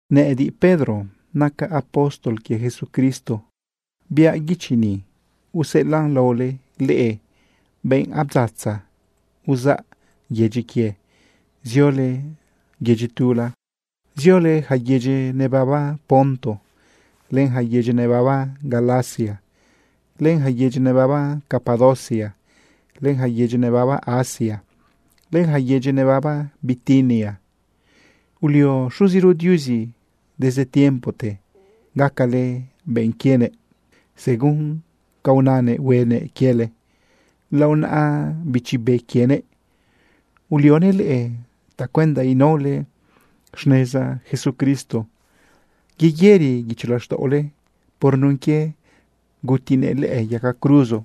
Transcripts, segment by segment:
Nëꞌëdiꞌ, Pedro, nacaꞌ apóstol quie Jesucristo. Biaꞌ guichi ni useꞌelaꞌn laole leꞌe benꞌ abdzatza uzaꞌ yedyi quie ziole yedyi tula, ziole yaca yedyi nebaba Ponto, len yaca yedyi nebaba Galacia, len yaca yedyi nebaba Capadocia, len yaca yedyi nebaba Asia, len yaca yedyi nebaba Bitinia. Ulio Xuziro Diuzi desde tiempote gacale benꞌ quienëꞌ según ca unanëꞌ huenëꞌ quiele. Lao naꞌa Bichi Be quienëꞌ ulionëꞌ leꞌe tacuenda inaole xneza Jesucristo yeyëri guicho laxtaꞌole por nun quie gutinëꞌ lëꞌë yaga cruzo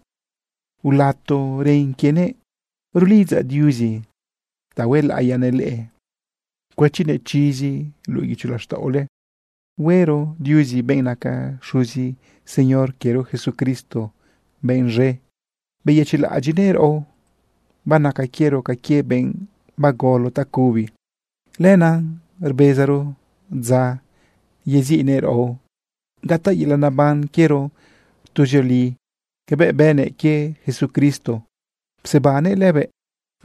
ulato ren quienëꞌ. Rulidzaꞌ Diuzi ta huelaꞌiyanëꞌ leꞌe cuëchinëꞌ chizi luꞌu guicho laxtaꞌole. Huero Diuzi, benꞌ naca Xuzi Señor quiero Jesucristo, benꞌ z̃e. Beyëchiꞌlaꞌadyiꞌnëꞌ raꞌo, banaca quiero ca quie benꞌ bagolo tacubi. Lenaꞌ rbezaro dza yeziꞌnëꞌ raꞌo gataꞌ yelaꞌ neban quiero tuzioli cabëꞌ bënëꞌ quie Jesucristo, psebannëꞌ lëbëꞌ.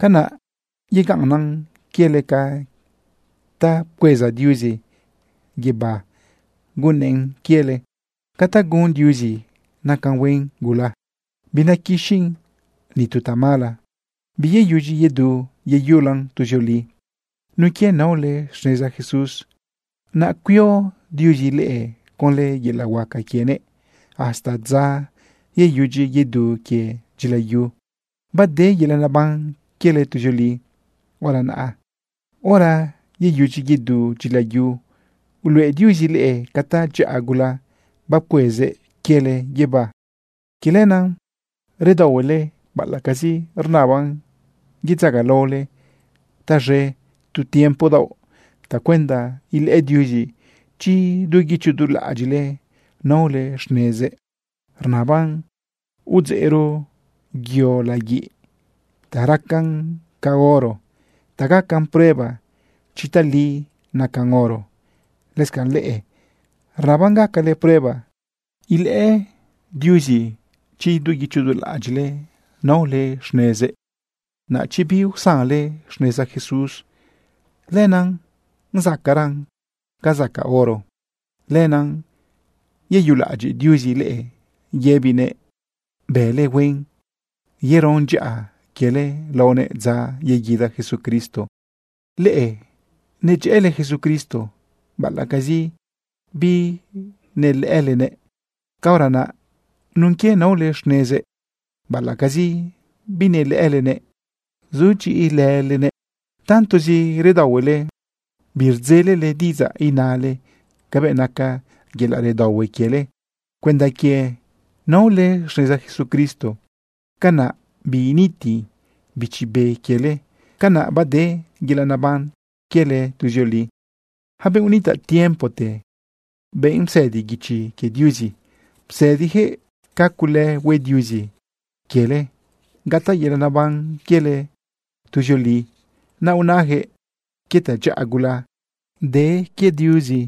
Canaꞌ yegaꞌnnan quiele ca ta pcueza Diuzi guibá gunnëꞌn quiele. Ca ta gun Diuzi nacan huen gula, binaquixin ni tu tamala. Biyeyudyi yedu yeyulan tuzioli. Nun quie naole xneza Jesús, nacuiꞌo Diuzi leꞌe conlë yelaꞌ huaca quienëꞌ hasta dza yeyudyi yedu quie dyilayu bade yelaꞌ neban quiele tuzioli. Hora naꞌ, hora yeyudyi yedu dyilayu, uluꞌe Diuzi leꞌe ca tadyaꞌa gula bapcuezëꞌ quiele guibá. Quie lenaꞌ redaohuele baꞌalaꞌcazi rnaban yedzagalaole taz̃e tu tiempo daoꞌ tacuenda ilëꞌë Diuzi chi du guicho du laꞌadyiꞌle naole xnezëꞌ. Rnaban udzeꞌro yo laguiꞌ ta racan ca oro ta gaca prueba chi tali nacan oro. Lëscanꞌ leꞌe, rnaban gacale prueba ilëꞌë Diuzi chi du guicho du laꞌadyiꞌle naole xnezëꞌ. Naꞌ chi biusanle xneza Jesús, lenaꞌ zacaꞌran ca zacaꞌ oro. Lenaꞌ yeyulaꞌadyiꞌ Diuzi leꞌe yëbinëꞌ bële huen, yeron dyaꞌa quiele laonëꞌ dza yeguida Jesucristo. Leꞌe nedyëꞌële Jesucristo baꞌalaꞌcazi binelëꞌëlenëꞌ. Caora naꞌ nun quie naole xnezëꞌ baꞌalaꞌcazi binelëꞌëlenëꞌ, zudyiꞌilëlenëꞌ. Tantozi redaohuele, birdzelele diꞌidzaꞌ inale cabëꞌ naca yelaꞌ redaohue quiele. Cuenda quie naole xneza Jesucristo, canaꞌ biiniti bichi be quiele, canaꞌ bade yelaꞌ neban quiele tuzioli. Yaca benꞌ unitaꞌ tiempote, benꞌ psëdi guichi quie Diuzi, psëdijëꞌ ca cule hue Diuzi quiele gataꞌ yelaꞌ neban quiele tuzioli, naꞌ unajëꞌ quie tadyaꞌa gula de quie Diuzi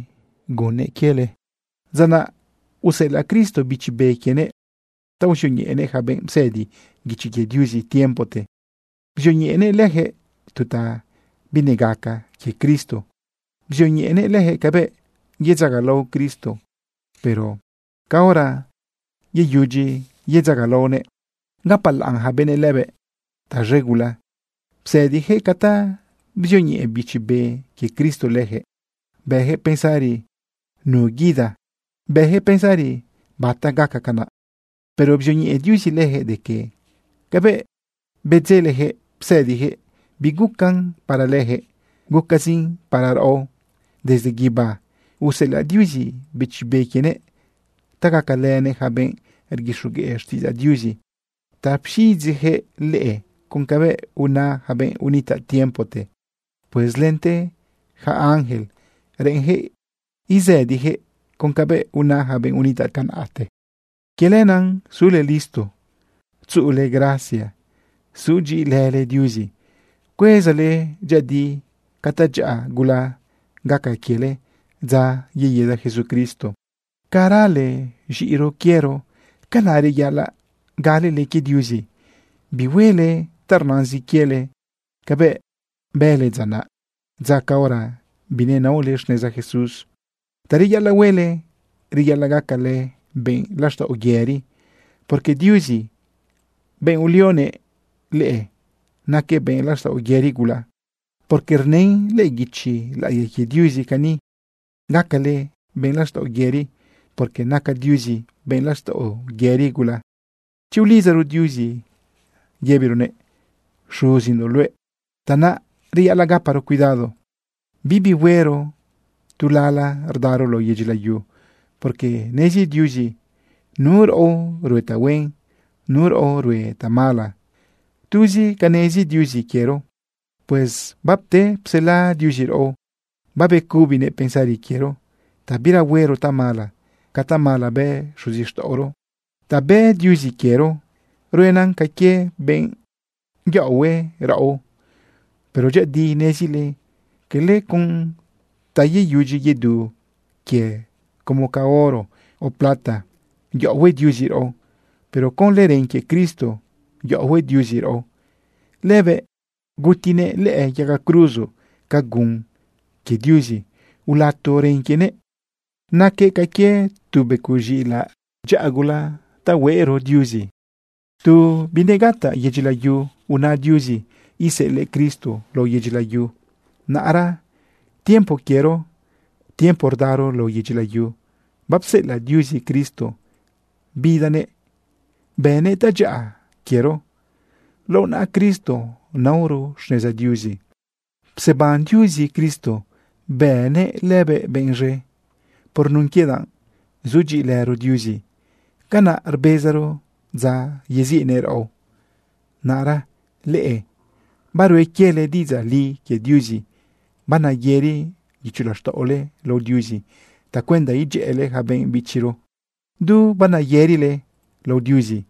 gunnëꞌ quiele. Dza naꞌ useꞌelaꞌ Cristo Bichi Be quienëꞌ ta uzioñeꞌenëꞌ yaca benꞌ psëdi guichi quie Diuzi tiempote. Bzioñeꞌenëꞌ lëjëꞌ tu ta binegaca quie Cristo. Bzioñeꞌenëꞌ lëjëꞌ cabëꞌ yedzagalao Cristo, pero caora yeyudyi yedzagalaonëꞌ, gapalaꞌn yaca benëꞌ lëbëꞌ taz̃e gula. Psëdijëꞌ ca ta bzioñeꞌe Bichi Be quie Cristo lëjëꞌ. Bëjëꞌ pensari nu guida. Bëjëꞌ pensari bata gaca canaꞌ. Pero bzioñeꞌe Diuzi lëjëꞌ de que cabëꞌ bedzelejëꞌ psëdijëꞌ bigucan para lëjëꞌ, gucacazin para raꞌo. Desde guibá useꞌelaꞌ Diuzi Bichi Be quienëꞌ ta gacalënëꞌ yaca benꞌ rguixogueꞌ xtiꞌidzaꞌ Diuzi ta pxiꞌidzeꞌjëꞌ leꞌe con cabëꞌ una ja benꞌ unitaꞌ tiempote. Pues lente ja ángel reꞌenjëꞌ isëdijëꞌ con cabëꞌ una yaca benꞌ unitaꞌ tiempote. Quie lenaꞌ sule listo tzuꞌule gracia. Sudyiꞌilële Diuzi cuezale dyëꞌëdi ca tadyaꞌa gula gaca quiele dza yeguida Jesucristo. Ca rale z̃iꞌiro quiero, canaꞌ reyaꞌalaꞌ galele quie Diuzi. Bihuele ta rnazin quiele cabëꞌ bële dza naꞌ, dza caora binenaole xneza Jesús. Ta reyaꞌalaꞌ huele, reyaꞌalaꞌ gacale benꞌ laxtaꞌo yëri, porque Diuzi, benꞌ ulionëꞌ leꞌe, naquëꞌ benꞌ laxtaꞌo yëri gula. Porque rnën lëꞌë guichi laꞌiya quie Diuzi cani: “Gacale benꞌ laxtaꞌo yëri, porque naca Diuzi benꞌ laxtaꞌo yëri gula.” Chi ulidzaro Diuzi yëbironëꞌ: “Xuzindoꞌ luëꞌ”, tanaꞌ reyaꞌalaꞌ gaparo cuidado bibi huero tu lala rdaro lao yedyi layu, porque nezi Diuzi nu raꞌo rue tahuen, nu raꞌo rue tamala. Tuzi ca nezi Diuzi quiero. Pues bapte psela Diuzi raꞌo. Babecubinëꞌ pensari quiero ta bira huero tamala ca ta mala bë xuzixtaꞌoro. Ta bë Diuzi quiero ruenan ca quie benꞌ yaꞌohue raꞌo. Pero dyëꞌëdi nezile quele con ta yeyudyi yedu quie como ca oro o plata yaꞌohue Diuzi raꞌo, pero conlë ren quie Cristo yaꞌohue Diuzi raꞌo. Lëbëꞌ gutiguëꞌ lëꞌë yaga cruzo ca gun quie Diuzi ulato ren quienëꞌ. Naquëꞌ ca quie tu becoꞌ z̃iꞌilaꞌ dyaꞌa gula ta hueꞌro Diuzi. Tu binegataꞌ yedyi layu una Diuzi iseꞌelëꞌ Cristo lao yedyi layu. Naꞌra tiempo quiero, tiempo rdaro lao yedyi layu, bapseꞌelaꞌ Diuzi Cristo bidanëꞌ bënëꞌ tadyaꞌa quiero. Lao naꞌa Cristo naoro xneza Diuzi. Pseban Diuzi Cristo, bënëꞌ lëbëꞌ benꞌ z̃e. Por nun quie danꞌ zudyiꞌilëro Diuzi, canaꞌ rbezaro dza yeziꞌnëꞌ raꞌo. Naꞌra leꞌe, barue quiele diꞌidzaꞌ li quie Diuzi, baneyëri guicho laxtaꞌole lao Diuzi tacuenda idyëꞌële yaca benꞌ bichiro. Du baneyërile lao Diuzi,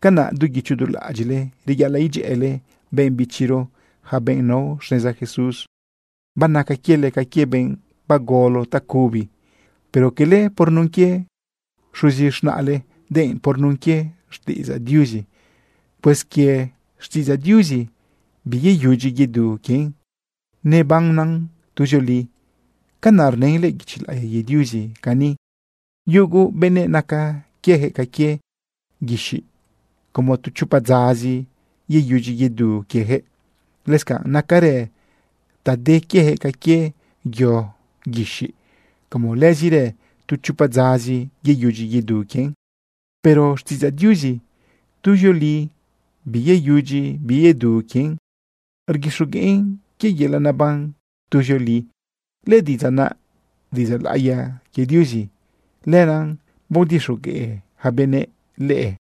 canaꞌ du guicho du laꞌadyiꞌle reyaꞌalaꞌ idyëꞌële benꞌ bichiro, yaca benꞌ nao xneza Jesús. Banaca quiele ca quie benꞌ bagolo tacubi, pero quele por nun quie xuzile z̃naꞌle, denꞌ por nun quie xtiꞌidzaꞌ Diuzi. Pues quie xtiꞌidzaꞌ Diuzi, biyeyudyi yedu quien, nebannan tuzioli. Canaꞌ rnën lëꞌë guichi laꞌiya quie Diuzi cani: Yugo benëꞌ naca quiejëꞌ ca quie guiz̃i, como tu chopa dzazi yeyudyi yedu quiejëꞌ. Lëscanꞌ nacarë ta de quiejëꞌ ca quie yo guixiꞌ, como lëzirë tu chopa dzazi yeyudyi yedu quien. Pero xtiꞌidzaꞌ Diuzi, tuzioli biyeyudyi biyedu quien. Rguixogueꞌn quie yelaꞌ neban tuzioli. Lëdiꞌidzaꞌ naꞌ, diꞌidzaꞌ laꞌiya quie Diuzi, lenaꞌ baodixogueꞌ yaca benëꞌ leꞌe.